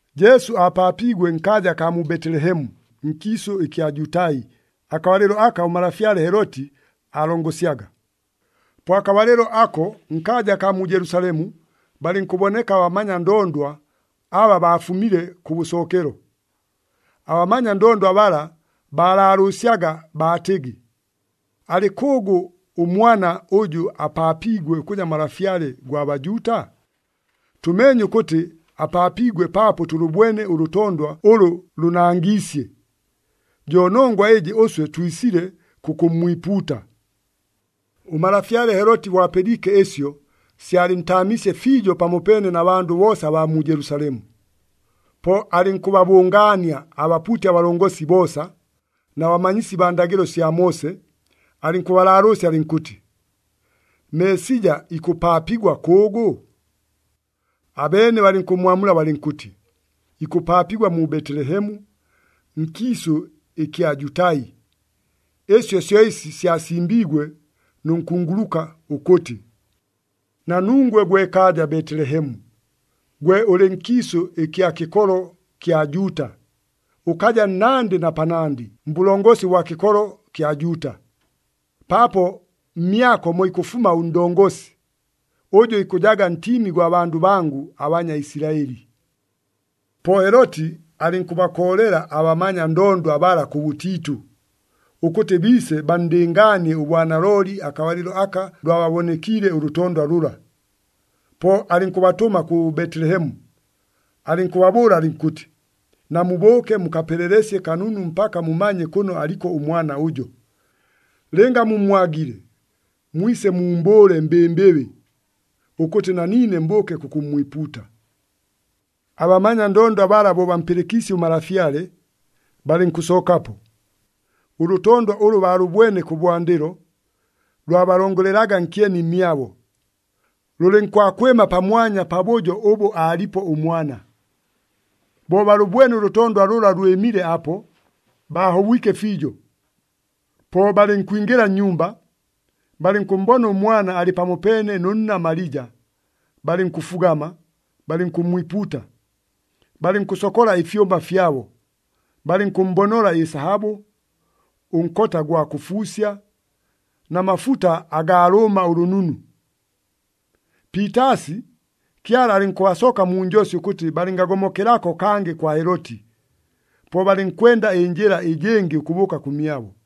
Jesu aapaapiigwe nkaaja akaa mu Betelehemu, nkiisʉ ɨkya Jutai, akabalɨlo aka ʉmalafyale Heloti aalongosyaga. Po akabalɨlo ako, nkaaja akaa mu Jelusalemu, balɨnkʉboneka abamanya ndondwa aba baafumile kʉbʉsookelo. Abamanya ndondwa bala baalaalʉʉsyaga baatɨgɨ, “Alɨ kʉʉgʉ ʉmwana ʉjʉ apaapiigwe ʉkʉja Malafyale gwa Bajuuta? Tʉmeenye ʉkʉtɨ apaapiigwe paapo tʉlʉbwene ʉlʉtondwa ʉlʉ lʉnangiisye. Jo nongwa ɨjɨ ʉswe twisile kʉkʉmmwipuuta.” Ʉmalafyale Heloti bo apɨliike ɨsyo, syalɨntaamiisye fiijo pamopeene na bandʉ boosa abaa mu Jelusalemu. Po alɨnkʉbabʉngaania abapuuti abalongosi boosa na bamanyisi baa ndagɨlo sya Moose, alɨnkʉbalaalʉʉsya alɨnkʉtɨ, “Meesija ikʉpaapigwa kʉʉgʉ?” Abeene balɨnkʉmmwamula balɨnkʉtɨ, “Ikʉpaapigwa mu Betelehemu, nkiisʉ ɨkya Jutai. Ɨsyo syo ɨsi syasimbiigwe nʉ nkunguluka ʉkʉtɨ, ‘Na nungwe gwe kaaja Betelehemu, gwe ʉlɨ nkiisʉ ɨkya kɨkolo kya Juuta, ʉkaja nnandɨ na panandɨ mbʉlongosi ʉbwa kɨkolo kya Juuta! Paapo mmyako mo ikʉfuma ʉndongosi, ʉjʉ ikʉjaga ntiimi gwa bandʉ bangʉ aBanyaisilaɨli.’” Po Heloti alɨnkʉbakoolela abamanya ndondwa bala kʉbʉtiitʉ, ʉkʉtɨ biise banndɨngaanie ʉbwanalooli akabalɨlo aka lwababonekiile ʉlʉtondwa lʉla. Po alɨnkʉbatʉma kʉ Betelehemu, alɨnkʉbabʉʉla alɨnkʉtɨ, “Namubʉʉke mukapelelesye kanunu mpaka mumanye kʉno aliko ʉmwana ʉjo. Lɨnga mummwagile, mwise muumbʉʉle mbɨmbɨbɨ, ʉkʉtɨ na niine mbʉʉke kʉkʉmmwipuuta.” Abamanya ndondwa bala bo bampɨlɨkiisye ʉmalafyale, balɨnkʉsookapo. Ʉlʉtondwa ʉlʉ baalʉbwene kʉbwandɨlo, lwabalongolelaga nkyeni mmyabo, lʉlɨnkwakwɨma pamwanya pabʉjo ʉbʉ aalipo ʉmwana. Bo balʉbwene ʉlʉtondwa lʉla lwɨmile apo, baahobwike fiijo. Po balɨnkwingɨla nnyumba, balɨnkʉmmbona ʉmwana alɨ pamopeene nʉ nna Malija, balɨnkʉfugama, balɨnkʉmmwipuuta. Balɨnkʉsokola ɨfyʉma fyabo, balɨnkʉmmbonola ɨsahabʉ, ʉnkota ʉgwa kʉfuusya na mafuta agaa lʉʉma ʉlʉnunu. Piitaasi, Kyala alɨnkʉbasoka mu njosi ʉkʉtɨ balɨngagomokelako kangɨ kwa Heloti. Po balɨnkwenda ɨnjɨla ɨjɨngɨ ʉkʉbʉʉka kʉmyabo.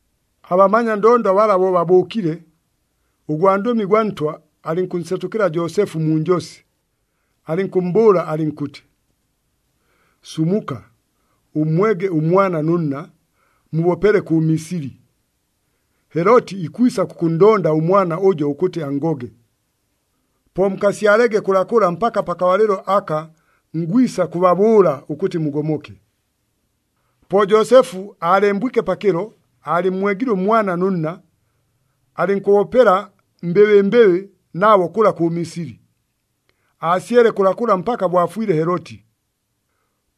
Abamanya ndondwa bala bo babʉʉkile, ʉgwandʉmi gwa Ntwa alɨnkʉnsetʉkɨla Joosefu mu njosi, alɨnkʉmmbʉʉla alɨnkʉtɨ, “Sumuka, ʉmmwege ʉmwana nʉ nna, mubopele kʉ Misili. Heloti ikwisa kʉkʉnndonda ʉmwana ʉjo ʉkʉtɨ anngoge. Po mukasyalege kʉlakʉla mpaka pakabalɨlo aka ngwisa kʉbabʉʉla ʉkʉtɨ mugomoke.” Po Joosefu aalembwike pakɨlo, aalɨmmwegile ʉmwana nʉ nna, alɨnkʉbopela mbɨbɨmbɨbɨ nabo kʉla kʉ Misili. Aasyele kʉlakʉla mpaka bo afwile Heloti.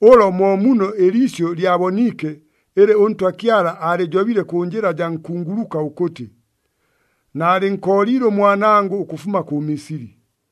Ʉlo mo muno ɨliisyʉ lyaboniike ɨlɨ ʉNtwa Kyala aalɨjobile kʉ njɨla jaa nkunguluka ʉkʉtɨ, “Naalɨnkooliile ʉmwanangʉ ʉkʉfuma kʉ Misili.”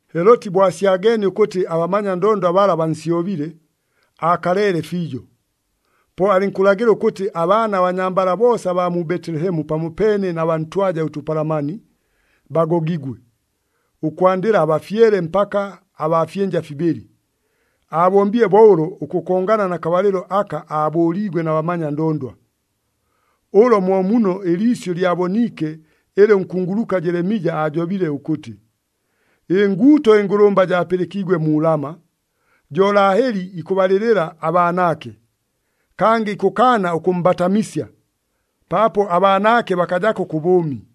Heloti bo asyageenie ʉkʉtɨ abamanya ndondwa bala bansyobile, aakaleele fiijo. Po alɨnkʉlagɨla ʉkʉtɨ abaana abanyambala boosa abaa mu Betelehemu pamopeene na baa ntwaja ʉtʉpalamani, bagogigwe, ʉkwandɨla abafyele mpaka abaa fyɨnja fibɨlɨ. Aabombile bo ʉlo ʉkʉkongana na kabalɨlo aka aabʉʉliigwe na bamanya ndondwa. Ʉlo mo muno ɨliisyʉ lyaboniike ɨlɨ ʉnkunguluka Jelemija aajobile ʉkʉtɨ, “Ɨnguuto ɨngʉlʉmba jaapɨlɨkiigwe mu Lama, jo Laheli ikʉbalɨlɨla abaanaake, kangɨ ikʉkaana ʉkʉmmbatamisya, paapo abaanaake bakajako kʉ bʉʉmi.”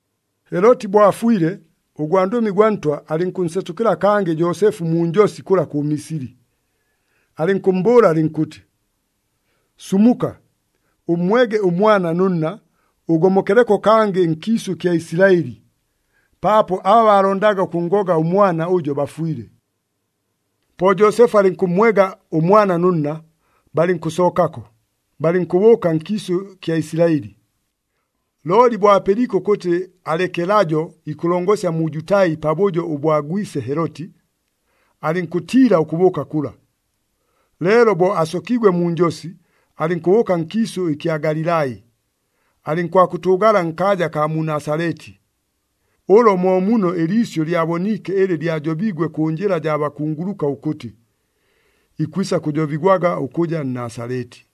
Heloti bo afwile, ʉgwandʉmi gwa Ntwa alɨnkʉnsetʉkɨla kangɨ Joosefu mu njosi kʉla kʉ Misili. Alɨnkʉmmbʉʉla alɨnkʉtɨ, “Sumuka, ʉmmwege ʉmwana nʉ nna, ʉgomokeleko kangɨ nkiisʉ kya Isilaɨli, paapo aba baalondaga ʉkʉnngoga ʉmwana ʉjo bafwile.” Po Joosefu alɨnkʉmmwega ʉmwana nʉ nna, balɨnkʉsookako, balɨnkʉbʉʉka nkiisʉ kya Isilaɨli. Looli bo apɨliike ʉkʉtɨ Alekelajo ikʉlongosya mu Jutai pabʉjo ʉbwa gwise Heloti, alɨnkʉtiila ʉkʉbʉʉka kʉla. Leelo bo asokiigwe mu njosi, alɨnkʉbʉʉka nkiisʉ ɨkya Galilai. Alɨnkwakʉtʉʉgala nkaaja akaa mu Nasaleti. Ʉlo mo muno ɨliisyʉ lyaboniike ɨlɨ lyajobiigwe kʉ njɨla jaa bakunguluka ʉkʉtɨ, “Ikwisa kʉjobigwaga ʉkʉja Nnasaleti.”